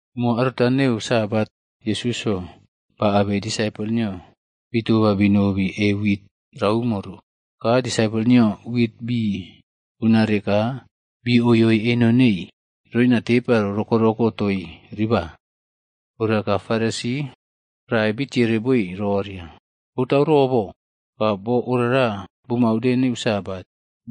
Umo aruta neu Sabat, Yesusꞌyo ba abei disaipol nio bii toba binobi e wit raumo ro. Ka disaipol nio wit bii bunare ka bii oioi eno nei roina tepa ro rokoꞌroko toii riba. Ora ka Faresi prae bitiere boi roria, “Botau robo, ka boo orara bumau de neu Sabat,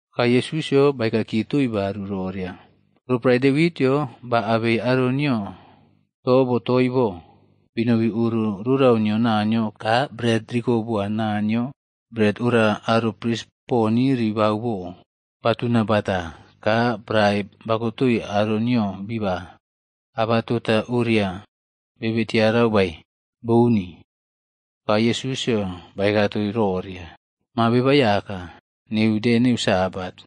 Ka Yesusꞌyo baeka kiye toii baru roria, “Roporae Devitꞌyo ba abei aro nio to botoi bo, banoi oro rorau nio Naniyo ka bret riko boa Naniyo bret ora aro pris poni riba bo, batuna bata ka prae bakotoi aro nio biba. Abatota oria bebe tiarau bae? Bouni.” Ka Yesusꞌyo baeka toii roria, “Maa Beba Aiyaka, neu de Sabat.”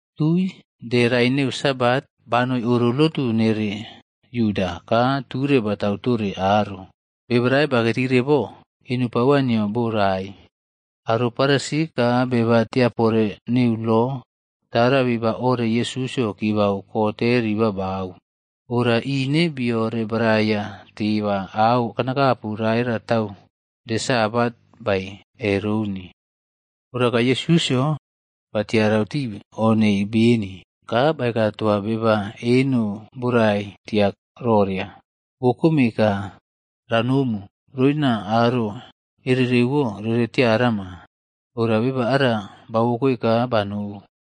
Tui de rae neu Sabat, banoi oro lotu nere Yuda ka ture batau tore aro. Beba rae bakei tire bo, eno pauwa nio borai. Aro Farisi ka beba tiapore neu lob tara biba ore Yesusꞌyo kibau kote rii babau. Ora ine bii orebaraiya teba auꞌkanakapu ratare tau de Sabat bae, e roun. Ora ka Yesusꞌyo ba tiarau tii o nei beni, ka baeka toa beba eno borai tia roria, “Wokome ka ranomu roina aro ererewo rere tiarama.” Ora beba ara bauwokoe ka banou.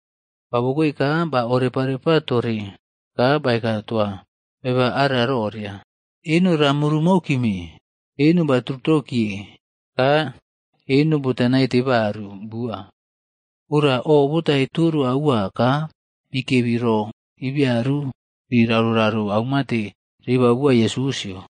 Ba uwekoe ka ba orepaꞌrepa toore ka baeka toa beba ara roria, “Eno ra murumou kime.” Eno baturutou kiye ka eno bota naite baru bua. Ora o botaii toro aua ka bikebi ro ibiaru bii raroꞌraro aumate ribau boa Yesusꞌyo.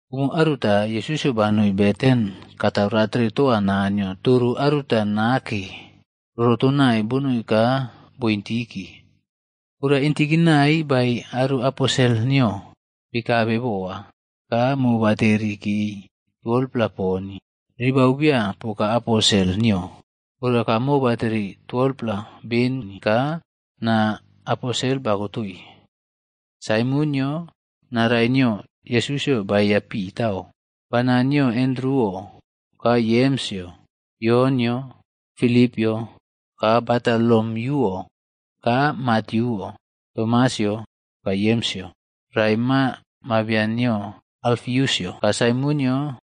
Umo aruta, Yesusꞌyo banoi beten katau ratere toa Naniyo toro aruta nake rorotonai bonoi ka bo intiki. Ora intikinai baei aro aposel nio bii kabe boa. Ka mobaterikeii 12-pla poni ribau bia poka aposelc nio. Oraka mobateri beni ka naa aposel bakotoi. Saimonꞌyo, naa rae nio Yesusꞌyo baeya Pitaꞌo, bana nio Andruꞌo, ka Yemsꞌyo, Yonꞌyo, Filipꞌyo ka Batolomiyuꞌo, ka Matyuꞌo, Tomasꞌyo ka Yemsꞌyo rae, maa mabian nio Alfiusꞌyo, ka Saimonꞌyo,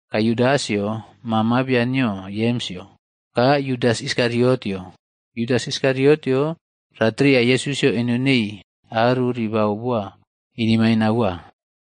ka Yudasꞌyo, maa mabian nio Yemsꞌyo, ka Yudas Iskariotꞌyo. Yudas Iskariotꞌyo ratreya Yesusꞌyo eno neii aro ribau boa inemaine aua.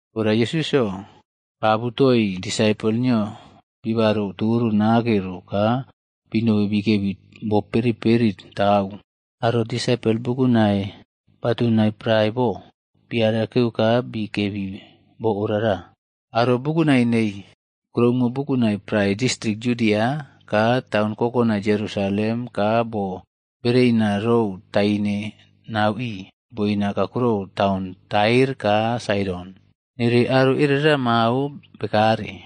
Ora Yesusꞌyo ba abutoii disaipol nio bibaro toro nake ro ka binobi bikebi bo boperiꞌperitau. Aro disaipol bukunai batunai prae bo, bii arakere ka bii kebii bo orara. Aro bukunai neii kuroumo bukunai prae distrik Yudia ka taun kokonai Yerusalem ka bo bereina rou taine nauꞌii boina kakurona taun Tair ka Saidon, nere aro erera mao bekare.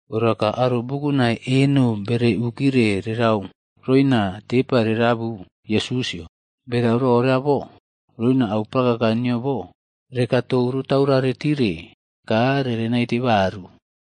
Ora ka aro bukunai eno bere ukire kerau roina tepa rera abu Yesusꞌyo, berau rora bo, roina au prakaka nio bo, rekaꞌtou rotaurare tire ka rere naite baru.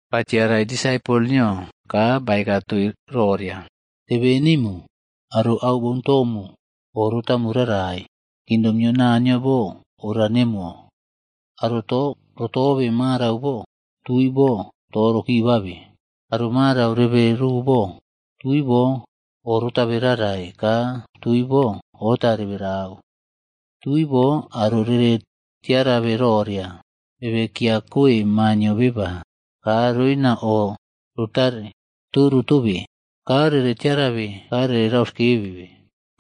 Ba tiaraii disaipol nio ka baeka toii roria, “Tebenemu, aro au boun tomu o rotamu rarai. Kingdom nio Naniyo bo ora nemuwo. Aro to rotobe marau bo, tui bo to rokibabe. Aro marau rebe roo bo, tui bo o rotabe rarai, ka tui bo ota reberau. Tui bo aro rere tiarabe roria, bebe kiꞌkiya koe Maa nio Beba, ka roina o rotare toro tobe, ka rere tiarabe ka rere rauskebe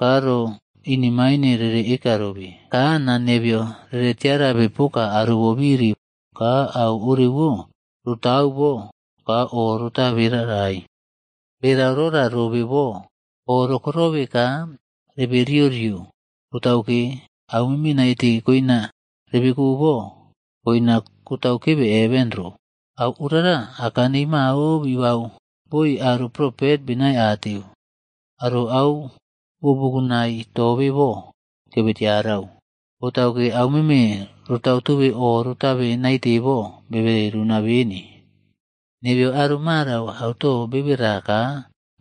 ka ro inemaine rere eka robe. Ka naa nebeyo rere tiarabe poka aro bobiri. Ka au orewo rotau bou ka o rotabe rarai. “Berau rora robe bo, o rokoirobe ka rebe riorio, botau ke auꞌmeme naite koina rebeko bo, koina kotau kebe heven ro. Au orara, aka nei mao bibau boi aro propet benai ateu. Aro au bo bukunai tobe bo kebe tiarau, botauke, auꞌmeme rotau tobe o rotabe naite bo, bebe runa beni. Nebeyo aro marau auto bebera ka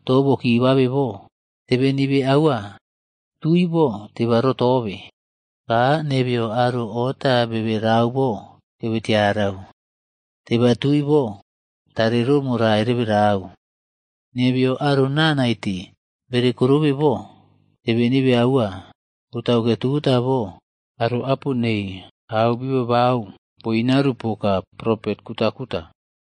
to bokibabe bo, tebenibe aua, tui bo teba rotobe. Ka nebeyo aro ota bebe rau bo, kebe tiarau, teba tui bo tarero morai reberau. Nebeyo aro naa naite bekorobe bo, tebenibe aua, botauke tota bo, aro apo nei au bi babau boꞌinearu poka propet kutaꞌkuta.”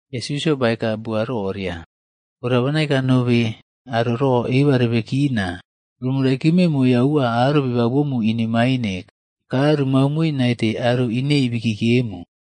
Yesusꞌyo baeka bua roria, “Ora bana eka nobe aro ro eba rebe kina. Rumu niyokonau aua aro bibau bomu inemaine ka rumau moi naite aro inei bikiyemu.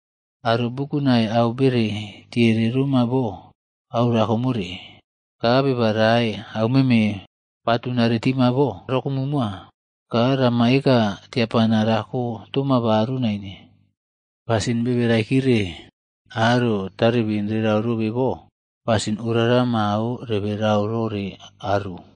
Aro bukunai au bere tiere roma bo, au rakomore. Ka beba rae auꞌmeme batunare tima bo rokomu moa ka rama eka tiapana rako toma baru naine. Pasin bebe raikire, aro taribin rerau robe bo, pasin orara mao rebe rau rore aru.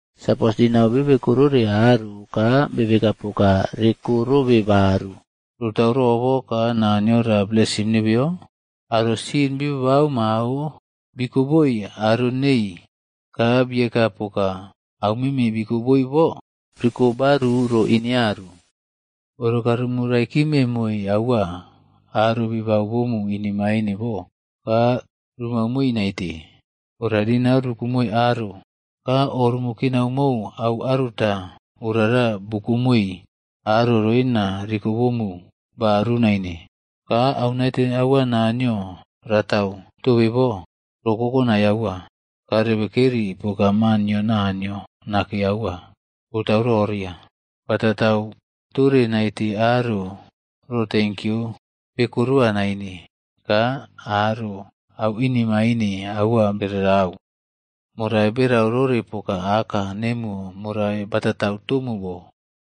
Sapos dinau bebe koroi aro ka bebe eka poka rekorobe baru, rotau robo ka Naniyo ra blesim nebeyo? Aro sin bibabau mao bikoboi aro nei, ka bieka poka, aumeme bikoboi bo riko baru ro inearu. Ora ka rumu raikime moi aua aro bibau bomu inemaine bo, ka rumau moi naite. Ora dinau rukome aro, ka o rumu kinau mou au aruta orara bukomoi aro roina rikobomu baru naine. Ka au naite aua Naniyo ratau tobe bo, ro kokonai aua, ka rebe kerii poka maa nio Naniyo Nake Aua. Botau roria, ba tatau tore naite aro ro tenkyu bekoroa naine ka aro auꞌinemain aua beraꞌrau. Morai reberau rore poka Aka nemuwo morai batatau tomu bo.”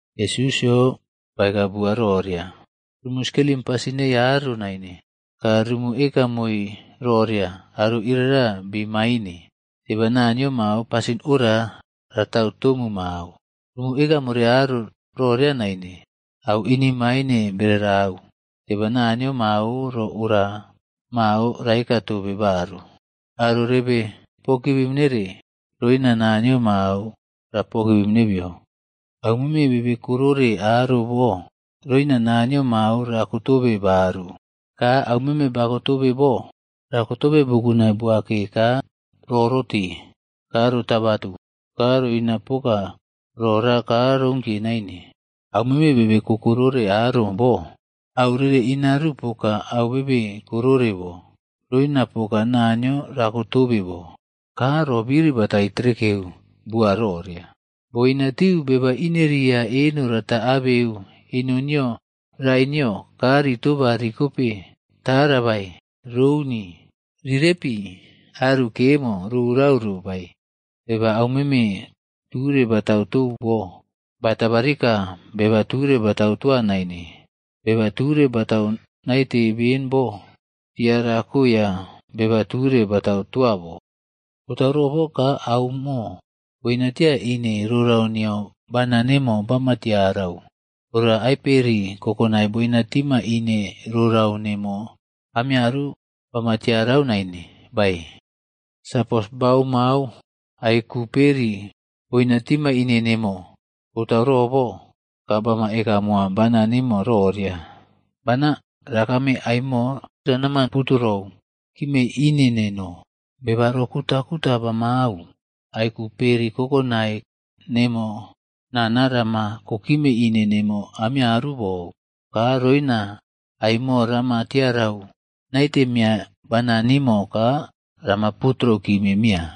Yesusꞌyo baeka bua roria, “Rumu skelim pasin nei aro naine, ka rumu eka moi roria aro iria bii maine, teba Naniyo mao pasin ora ratau tomu mao. Rumu eka more aro roria naine, au inemaine beraꞌrau, teba Naniyo mao ro ora mao raeka tobe baru. Aro rebe pogivim nere, roina Naniyo mao ra pogivim nebeyo. Au meme bebe korore aro bo roina Naniyo mao rako tobe baru, ka au meme bako tobe bo, rako tobe bukunai buake ka rorote ka rotabatu ka roina poka rora ka rounkiye naine. Au meme bebe koꞌko rore aro bo, au rere inaru poka au bebe korore bo, roinaru poka Naniyo rakotobe bo.” Ka ro biriꞌbatai trekeu bua roria, “Boinatiu beba ineria eno rata abeu eno nio rae nio ka ritoba rikope tara bae? Rouni. Ri repi aru kemo rorau ro bae? Beba aumeme ture batau tou bo, ba tabarika beba ture batau toa naine, beba ture batau naite ben bo, tia rakoiya beba ture batau toa bo. “Botau robo ka auꞌmo boina tia ine rorau nio bana nemo bama tiarau, ora ai peri kokonai boina tima ine rorau nemo amiaru bama tiarau nain bae? Sapos baomau ai ku peri boina tima ine nemo, botau robo, ka bama eka moa bana nimo roria, ‘Bana, rakame ai mo ranama puturou kime ine neno.’ Beba ro kutaꞌkuta bamau, ai ku peri kokonai nemo nana rama kokime ine nemo amiaru bou, ka roina ai mo rama tiarau naite miya bana nimo ka rama puturou kime miya.”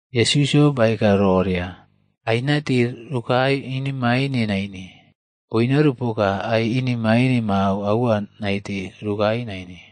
Yesusꞌyo baeka roria, “Ai naite rokae inemaine naine, boinaru poka ai inemaine mao aua naite rokae naine.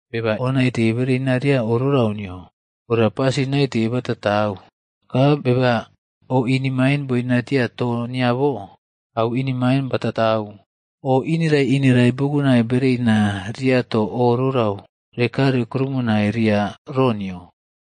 Beba o naite bereina ria oꞌrorau nio, ora pasin naite bataꞌtau. Ka beba, o inemaine boina tia to nio bo, au inemaine bataꞌtau. O ineraiꞌinerai bukunai bereina ria to o rorau rekare krumunai ria ro nio.”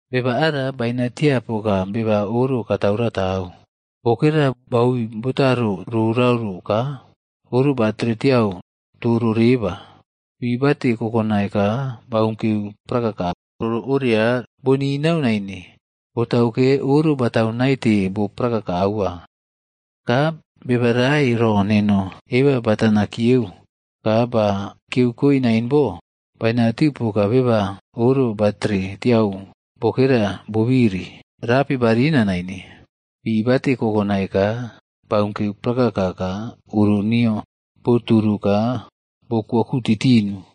“Beba ara ba inatia poka beba oro katau ratau. Bokera baui botaro rorau ro ka oro baora tiau toro reba. Pi bate kokonai ka bounkeu prakaka oro oria boninau naine, botauke oro batau naite bo prakaka aua. Ka beba rae ro neno eba batana kiyeu ka ba kiyeu koe nain bo, boinatiu poka beba oro batere tiau bokera bobiri rapi barina nain. Pi bate kokonai ka baunkeu prakaka ka oro nio boturu ka bokwoku titinu.”